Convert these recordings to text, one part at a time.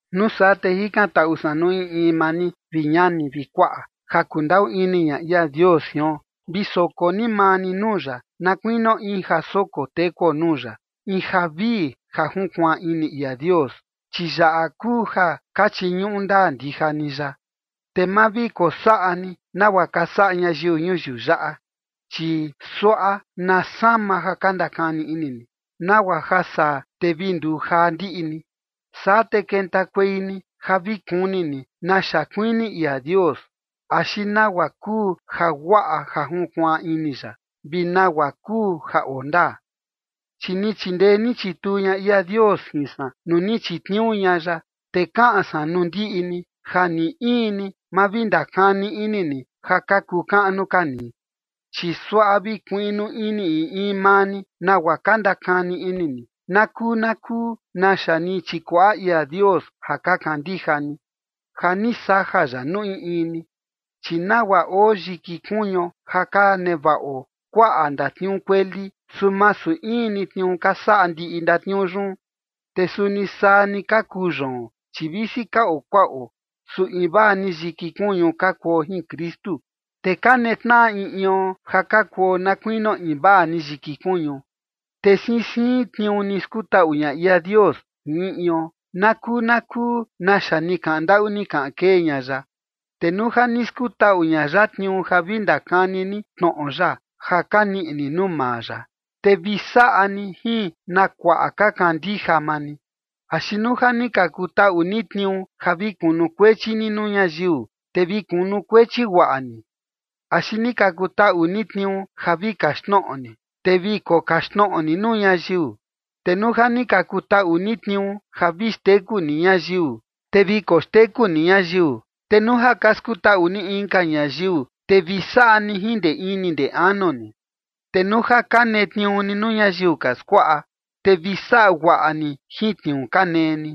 Nuu saa, te jikantaꞌu san nuu in in maa ni, vi ñani vi kuaꞌa, ja kundaꞌu ini ña ia Dios jion, vi soko ni maa ni nuu ya, na kuinio in ja soko tekuo nuu ya, in ja vii, ja junkuaan ini ia Dios. Chi yaꞌa kuu ja ka chiñuꞌu ndaa ndija ni ya. Te ma vi kosaꞌa ni nagua ka saꞌa ñayiu ñuyiu yaꞌa, chi suaꞌa na sama ja ka ndakani ini ni, nagua ja saa te vi nduu jaa ndiꞌi ni. Saa te kentakuei ni ja vi kuni ni naxa kuini ia Dios axi nagua kuu jaguaꞌa ja junkuaan ini ya, vi nagua kuu ja oo ndaa. Chi ni chindee ni chituu ña ia Dios jin san nuu ni chitniuu ña ya, te kaꞌan san nuu ndiꞌi ni ja ni in ni ma vi ndakani ini ni ja ka kuu kaꞌnu ka ni. Chi suaꞌa vi kuiꞌnu ini in in maa ni nagua ka ndakani ini ni na kuu na kuu naxa ni chikuaꞌa ia Dios ja ka kandija ni, ja ni saja ya nuu in in ni. Chi nagua oo yiki kuñuo ja ka nevaꞌo kuaꞌa ndatniuu kueli, su masu in ni tniuu ka saꞌa ndiꞌi ndatniuu yun. Te suni saa ni ka kuu yoon, chi visi ka oo kuaꞌo, su invaa ni yiki kuñu ka kuo jin Kristu. Te ka netnaꞌa in ion ja ka kuo na kuinio invaa ni yiki kuñu. Te siin siin tniuu ni skutaꞌu ña ia Dios jin in ion, na kuu na kuu naxa ni kaꞌan ndaꞌu ni kaꞌan kee ña ya. Te nuu ja ni skutaꞌu ña ya tniuu ja vi ndakani ni tnoꞌo ya ja ka niꞌi ni nuu maa ya, te vi saꞌa ni jin na kuaꞌa ka kandija maa ni. Axi nuu ja ni ka kutaꞌu ni tniuu ja vi kunukuechi ni nuu ñayiu, te vi kunukuechi guaꞌa ni. Axi ni ka kutaꞌu ni tniuu ja vi kaxtnoꞌo ni, te vi kokaxtnoꞌo ni nuu ñayiu. Te nuu ja ni ka kutaꞌu ni tniuu ja vi xteku ni ñayiu, te vi koxteku ni ñayiu. Te nuu ja ka skutaꞌu ni inka ñayiu, te vi saꞌa ni jin ndee ini ndee anu ni. Te nuu ja ka netniuu ni nuu ñayiu ka skuaꞌa, te vi saꞌa guaꞌa ni jin tniuu ka nee ni.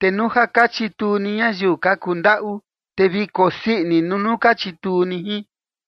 Te nuu ja ka chituu ni ñayiu ka kuu ndaꞌu, te vi kosii ini nuu ka chituu ni jin.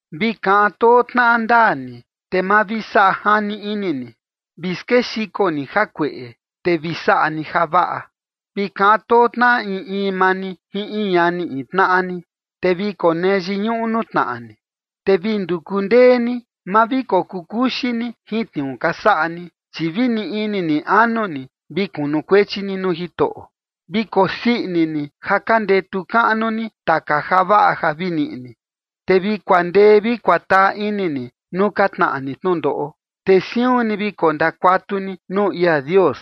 Vi kaꞌan too tnaꞌa ndaa ni, te ma vi saꞌa jani ini ni. Vi skexiko ni jakueꞌe, te vi saꞌa ni javaꞌa. Vi kaꞌan too tnaꞌa in in maa ni jin in ñani in tnaꞌa ni, te vi konee yiñuꞌu nuu tnaꞌa ni. Te vi nduku ndee ni, ma vi kokuu kuxii ni jin tniuu ka saꞌa ni, chi vi ni ini ni anu ni, vi kunukuechi ni nuu Jitoꞌo. Vi kosii ini ni ja ka ndetu kaꞌnu ni taka javaꞌa ja vi niꞌi ni, te vi kuandee vi kuataa ini ni nuu ka tnaꞌa ni tnundoꞌo, te siun ni vi kondakuatu ni nuu ia Dios.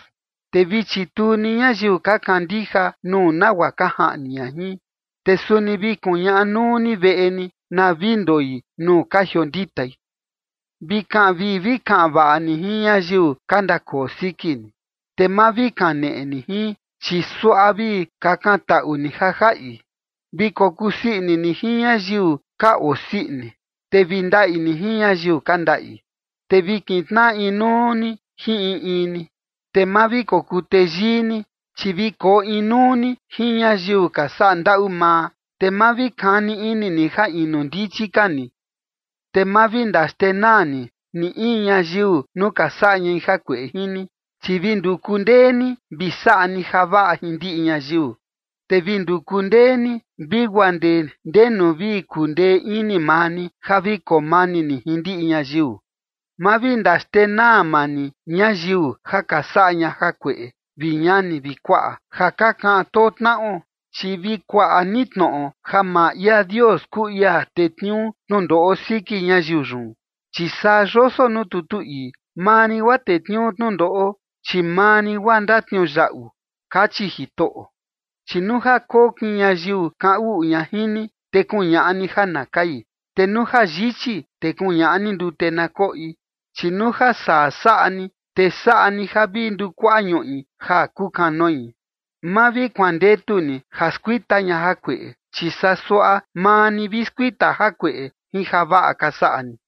Te vi chituu ni ñayiu ka kandija nuu nagua ka jaꞌni ña jin, te suni vi kuñaꞌa nuu ni veꞌe ni na vi ndoi nuu ka jionditai. Vi kaꞌan vii vi kaꞌan vaꞌa ni jin ñayiu ka ndakoo siki ni. Te ma vi kaneꞌe ni jin, chi suaꞌa vi kakantaꞌu ni ja jaꞌi. Vi kokusii ini ni jin ñayiu ka osii ini, te vi ndaꞌi ni jin ñayiu ka ndaꞌi. Te vi kintnaꞌa inuu ni jin in in ni. Te ma vi kokuu teyii ni, chi vi koo inuu ni jin ñayiu ka saꞌa ndaꞌu maa. Te ma vi kani ini ni ja inu ndichi ka ni. Te ma vi ndaxndenaa ni ni in ñayiu nuu ka saꞌa ñai jakueꞌe jin ni. Chi vi nduku ndee ni vi saꞌa ni javaꞌa jin ndiꞌi ñayiu. Te vi nduku ndee ni vi guaa ndee ndenu vi kundee ini maa ni ja vi koo mani ni jin ndiꞌi ñayiu. Ma vi ndaxtenaa maa ni ñayiu ja ka saꞌa ña jakueꞌe, vi ñani vi kuaꞌa, ja ka kaꞌan too tnaꞌo, chi vi kuaꞌa ni tnoꞌo ja maa ia Dios kuu ia tetniuu tnundoꞌo siki ñayiu yun. Chi saa yoso nuu tutu ii: “Maa rin guaa tetniuu tnundoꞌo, chi maa rin guaa ndatniuyaꞌu”, kachi Jitoꞌo. Chi “Nuu ja kokin ñayiu kaꞌan uꞌu ña jin ni, te kuñaꞌa ni ja na kai. Te nuu ja yichi, te kuñaꞌa ni ndute na koꞌi. Chi nuu ja saa saꞌa ni, te saꞌa ni ja vi ndukuaꞌa ñuꞌi ja kukanoi.” Ma vi kuandetu ni ja skuita ña jakueꞌe, chi saa suaꞌa maa ni vi skuita jakueꞌe jin javaꞌa ka saꞌa ni.